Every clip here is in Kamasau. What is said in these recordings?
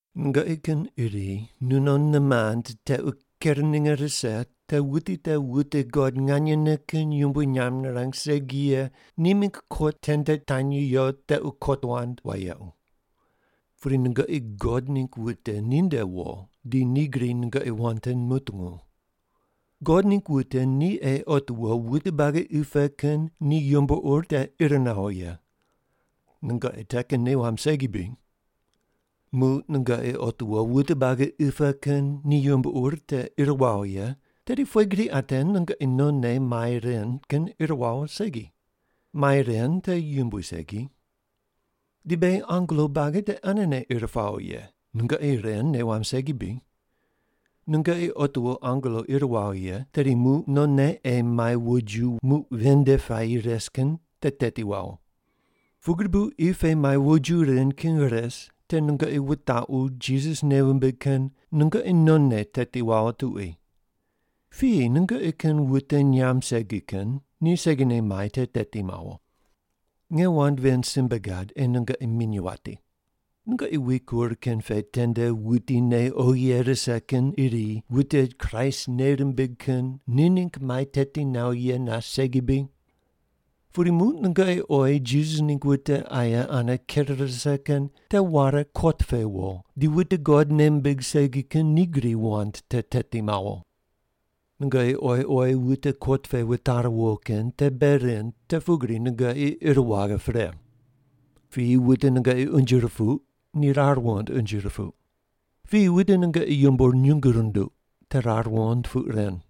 Nungoqi kin iri nunon nimand tequ ker ninge rise te wuti te wute God nganyene kin yumbui nyamb rirang segi ye ni mingg kot tende tanyi yo tequ kot wand wayequ. Pudi nungoqi God ningg wute ninde wo di ni gri nungoqi wand te mutungu. God ningg wute ni ei otiwo wute buagi qi pe kin ni yumbo ur te ir mawo ye. Nungoqi te kin nei wamb segi bri? Muq nungoqi otiwo wute buagi qi pe kin ni yumbo ur te ir wawo ye, tedi pughe gri ate nungoqi nonne mai ren kin ir wawo segi. Mai ren te yumbui segi. Di beghi angelo buagi te anene ir pawo ye. Nungoqi ren nei wamb segi bri? Nungoqi otiwo angelo ir wawo ye, tedi muq nonne ei mai woju muq ven nde puayi res kin te teti wawo! Pugri bu qi pe mai woju ren kin res te nungoqi wutaqu Jisas nei wumbig kin nungoqi nonne teti wawo tuqui. Piyi nungoqi kin wute nyamb segi kin ni segine mai te teti mawo. Nge wand ven simbe gad ei nungoqi minyuw wati. Nungoqi wikur kin pe tende wuti nei oghi ye rise kin iri wute Kraist nei rimbig kin ni ningg mai teti nawo ye nas segi bri? Pudi muq nungoqi oyi Jisas ningg wute aye ane ker rise kin te ware kot pe wo di wute God nei mimbig segi kin ni gri wand te teti mawo! Nungoqi oyi oyi wute kot pe wutare wo kin te bei rind te pugri nungoqi ir waghe pre. Piyi wute nungoqi unje rupuq, ni rar wuqond unje rupuq. Piyi wute nungoqi yumbo nyungu runduq, te rar wuqond puq ren.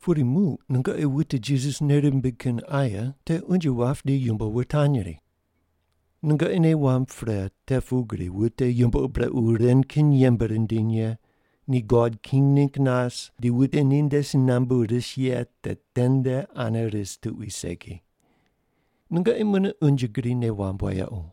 Pudi muq nungoqi wute Jisas nei rimbig kin aye te unje wap di yumbo wutanyri. Nungoqi nei wamb pre te pugri wute yumbo ur brequ ren kin yembe rindiny ye ni God king ningg nas di wute ninde si nambu ris ye te tende ane ris tuqui segi. Nungoqi mune unje gri nei wamb wayequ.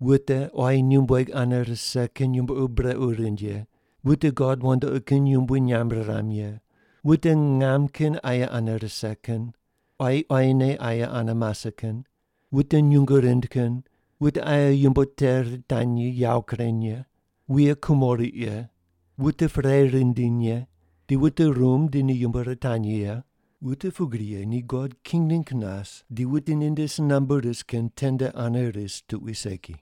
Wute quayi nyumbueg ane rise kin yumbo ur brequ rind ye, wute god wandoqi kin yumbui nyamb riram ye, wute ngam kin aye ane rise kin, quayi quayine aye ane mase kin, wute nyungu rind kin, wute aye yumbo te ritanyri yawo kureny ye, wuye kumo riq ye, wute perei rindiny ye, di wute rumb di ni yumbo ritanyri ye, wute pugri ye ni God king ningg nas di wute ninde si nambu ris kin tende ane ris tuqui segi.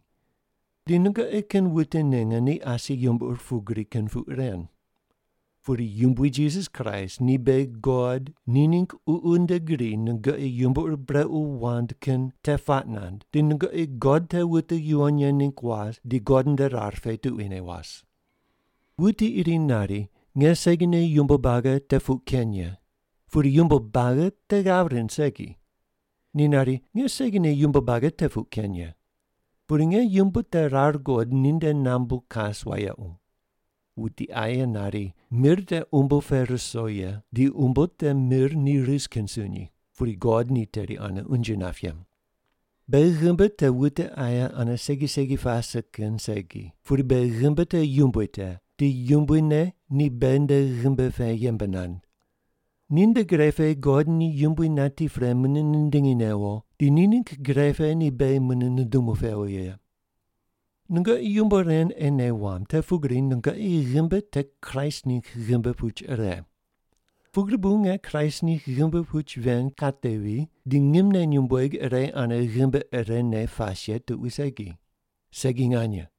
Di nungoqi kin wute ninge ni asi yumbo ur pugri kin puq ren. Pudi Yumbui Jisas Kraist di beghi God ni ningg Ququ nde gri nungoqi yumbo ur brequ wand kin te puaq nand di nungoqi God te wute yuwon ye ningg was di God nde rar pe tuquine was. Wuti iri nari, “Nge segine yumbo buagi te puq ken ye.” Pudi yumbo te buagi ane ghav rind segi. Ni nari, “Nge segine yumbo buagi te puq ken ye.” Pudi nge yumbo te rar guqod ninde nambu kas wayequ. Wuti aye nari, “Mir te umbo pe ruso ye di umbo te mir ni ris kin sunyi,” pudi God ni teri ane unje nap ye. Beghi ghimbi te wute aye ane segi segi pase kin segi, pudi beghi ghimbi te Yumbui te, di Yumbui ne ni beghi nde ghimbi pe yembe nand. Ninde gre pe God ni Yumbui nati pre mune nindingi newo di ni ningg gre pe ni beghi mune nundumu pewo ye. Nungoqi yumbo ren ei nei wamb te pugri nungoqi ghimbi te Kraist ningg ghimbi puch ire. Pugri bu nge Kraist ningg ghimbi puch ven katevi di ngimne nyumbueg ire ane ghimbi irene pas ye tuqui segi. Segi nganye!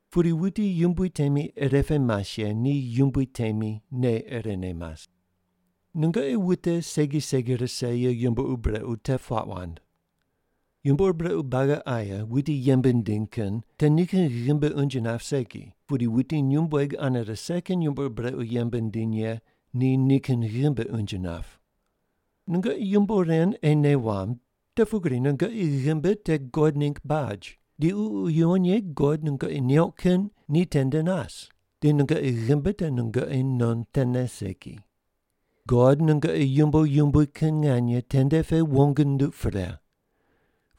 Pudi wuti Yumbui temi irepe mas ye ni Yumbui temi nei irene mas. Nungoqi wute segi segi rise ye yumbo ur brequ te puaq wand. Yumbo ur brequ buagi aye wuti yembe nindiny kin te nikin ghimbi unje nap segi, pudi wuti nyumbueg ane rise kin yumbo ur brequ yembe nindiny ye ni nikin ghimbi unje nap. Nungoqi yumbo ren ei nei wamb te pugri nungoqi ghimbi te God ningg baj di Ququ Yuwon Ye God nungoqi neuq kin ni tende nas, di nungoqi ghimbi te nungoqi non tene segi. God nungoqi yumbo yumbui kin nganye tende pe wong nunduq pre.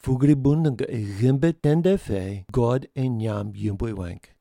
Pugri bu nungoqi ghimbi tende pe God ei nyamb yumbui weng.